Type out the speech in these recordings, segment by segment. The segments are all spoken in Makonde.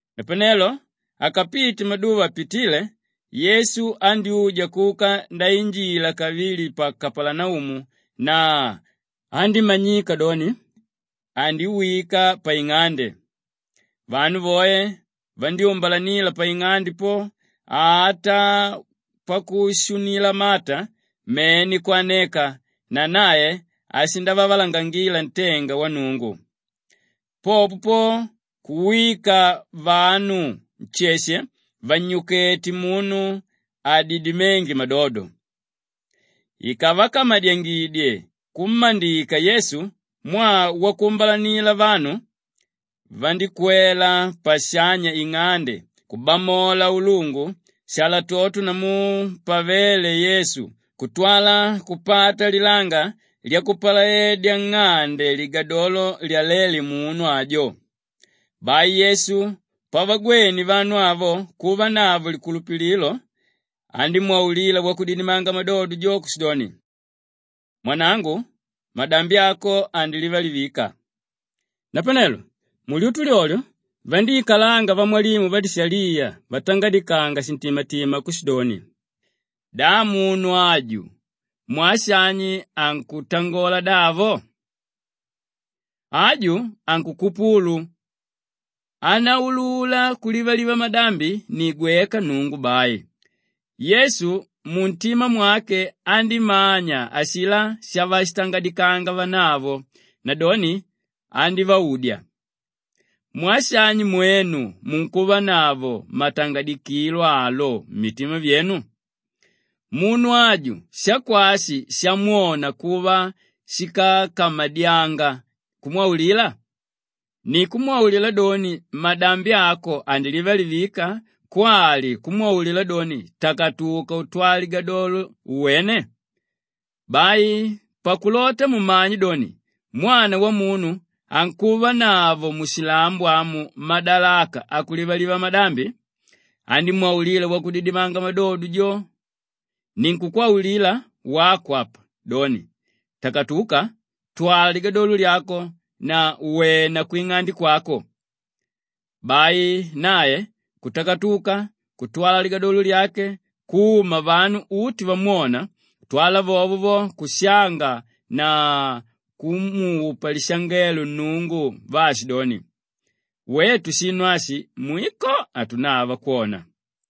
Napanelo akapite maduva apitile, Yesu andyúja kuka ndainjila kavili pa Kapalanaumu na andímanyika doni andiwika paing'ande. Vanu voe vandyúmbalanila paing'ande po ata pakushunila mata mene kwaneka na nae ashindavavalangangila ntenga wa Nnungu. Popo po kuwika vanu nsheshe vannyukete munu adidiménge madodo. Ikavakamadyangidye kummandika Yesu mwaa wakuumbalanila vanu, vandíkwela pashanya ing'ande kubamola ulungu shalatoto namu pavéle Yesu kutwala kupata lilanga lyakupalaedya nng'ande ligadolo lyaléle munu ajo. Bai Yesu pavagwene vanu avo kuvanavo likulupililo, andímwaulila wakudidimanga madodo jo kushidoni, “Mwanangu, madambi ako andilivalivika.” Napanelo mulyutu lyolyo vandíikalanga vamwalimu vadishaliya vatangadikanga shintimatima kushidoni, “Da munu aju mwaa shani ankutangola davo? Aju ankukupulu! Ánaulula kulivaliva madambi ni gweka Nnungu bai.” Yesu muntima mwake andímanya ashilá shavashitangadikanga vanavo nadoni andívaudya, “Mwaa shani mwenu munkuvanavo matangadikilo alo mmitima myenu? Munu aju shakwashi shamwona kuva shíkakamadyanga kumwaulila? Ni kumwaulila doni, ‘Madambi ako andilivalivika’ kwali kumwaulila doni, ‘Takatuka utwale ligadolo uwene’? Bai pakulota mumanye doni Mwana Wamunu ankuvanavo mushilambo amu madalaka akulivaliva madambi,” andímwaulila wakudidimanga madodo jo, “Ninkukwaulila wako apa doni, takatuka, twala ligadolo lyako na wena kwing'ande kwako.” Bai nae kutakatuka kutwala ligadolo lyake kuma vanu uti vamwona kutwala vovo vo kushanga na kumupa lishangelo Nnungu vaashidoni, “Wetu shinu ashi, mwiko hatunava kwona.”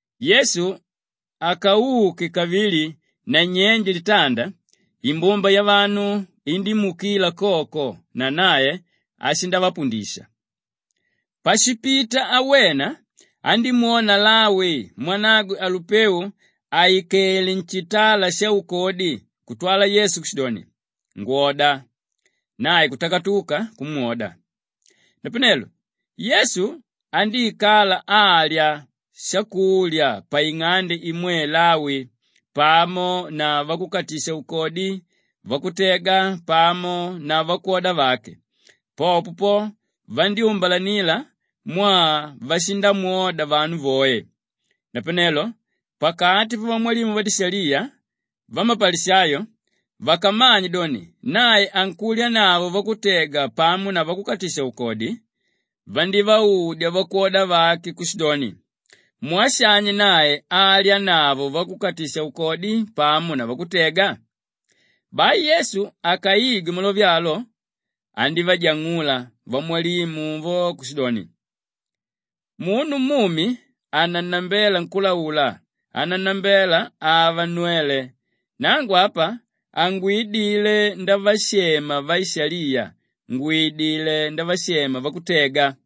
Yesu akauke kavili nanyenje litanda, imbumba yavanu indímuukila koko na nae ashindavapundisha. Pashipita awena, andímwona Lawi mwanagwe Alupeu àikele nshitala shaukodi kutwala Yesu kushidoni, “Ngwoda!” Nae kutakatuka kumwoda. Napanelo Yesu andíikala alya shakulya paing'ande imwe Lawi pamo na vakukatisha-ukodi, vakutega pamo na vakwoda vake; popo po vandyúmbalanila mwaa vashindamwoda vanu voe. Napanelo pakati pavamwalimu vadishaliya vamapalishayo, vakamanye doni nae ankulyanavo vakutega pamo na vakukatisha-ukodi, vandívaudya vakwoda vake kushidoni, “Mwaa shani nae alyanavo vakukatisha-ukodi pamo na vakutega?” Bai Yesu akaigwe malove alo, andívajang'ula vamwalimu vo kushidoni, “Munu mumi hanannambela nkúlaula, ánannambela ava nnwele. Nangu apa hangwidile ndavashema vaishaliya, ngwidilé ndavashema vakutega.”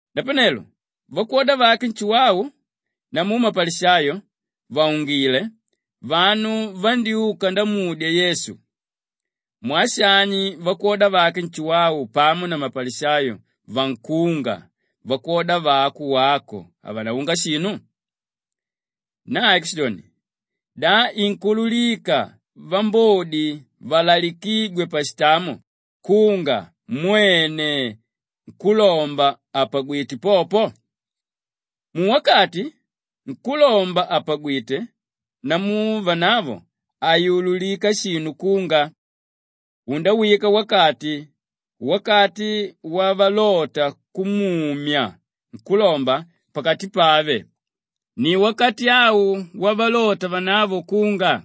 Napanelo vakwoda vake Nshuwau namu mapalishayo vàungile, vanu vandyúka ndamudya Yesu, “Mwaa shani vakwoda vake Nshuwau pamo na vamapalishayo vankunga, vakwoda vako wako havanaunga shinu?” Nae kushidoni, “Da inkuululika vambodi valalikígwe pashitamo kunga mwene nkúlomba àpagwite popo? Muwakati nkúlomba àpagwite namu vanavo hainaululika shinu kunga. Undawika wakati, wakati wavalota kumumya nkúlomba pakati pave; ni wakati au wavalota vanavo kunga.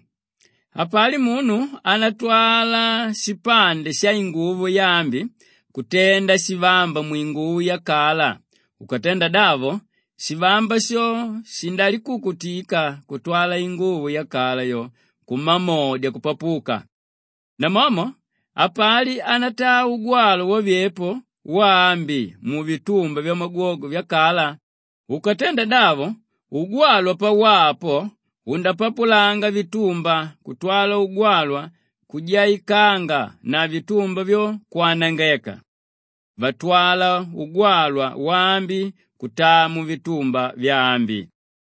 Hapali munu ánatwala shipande shainguvo yaambi kutenda shivamba mwinguvo yakala; ukatenda davo shivamba sho shindalikukutika kutwala inguvo yakala yo kumamodya kupapuka. Namomo hapali ánataa ugwalwa wavyepo waambi muvitumba vyamagwogwe vyakala; ukatenda davo, ugwalwa pawaa po, undapapulanga vitumba kutwala ugwalwa kujaikanga na vitumba vyo, kwanangeka. Vatwala ugwalwa waambi kutaa muvitumba vyambi.”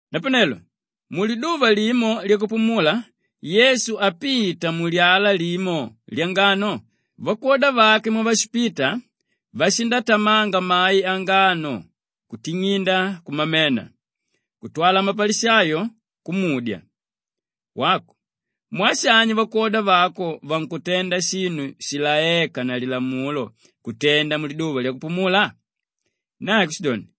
Napanelo muliduva limo lyakupumula Yesu apita mulyala limo lyangano vakwoda vake mwavashipita, vashindatamanga mai angano kuting'inda kumamena. Kutwala mapalishayo kumudya, “Wako, mwaa shani vakwoda vako vankutenda shinu shilaéka na lilamulo kutenda muliduva lyakupumula?” Nae kushidoni,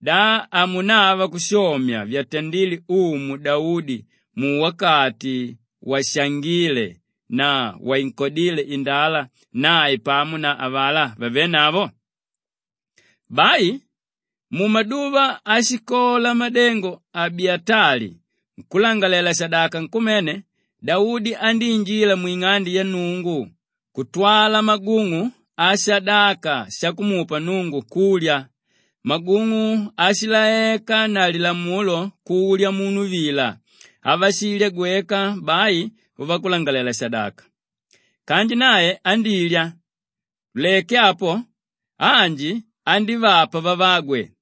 “Da hamunava kushomya vyatandile Umu Daudi muwakati washangíle na wainkodíle indala nae pamo na avalá vavénavo? Bai mumaduva áshikola madengo Abiyatali nkúlangalalela-shadaka nkumene, Daudi andíinjila mwing'ande ya Nnungu kutwala magung'u ashadaka shakumupa Nnungu kulya; magung'u áshilaeka na lilamulo kulya munu vila, avashilya gweka bai vakulangalalela-shadaka. Kanji nae andílya, tuleke apo anji andívapa vavagwe.”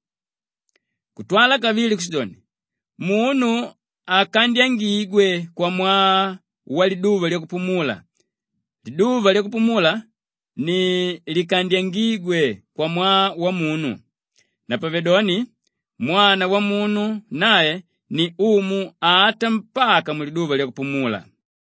Kutwala kavili kushidoni, “Munu hakandyangigwe kwamwaa waliduva lyakupumula, liduva lyakupumula ni likandyangígwe kwamwaa wamunu. Napavedoni Mwana Wamunu nae ni Umu ata mpaka muliduva lyakupumula.”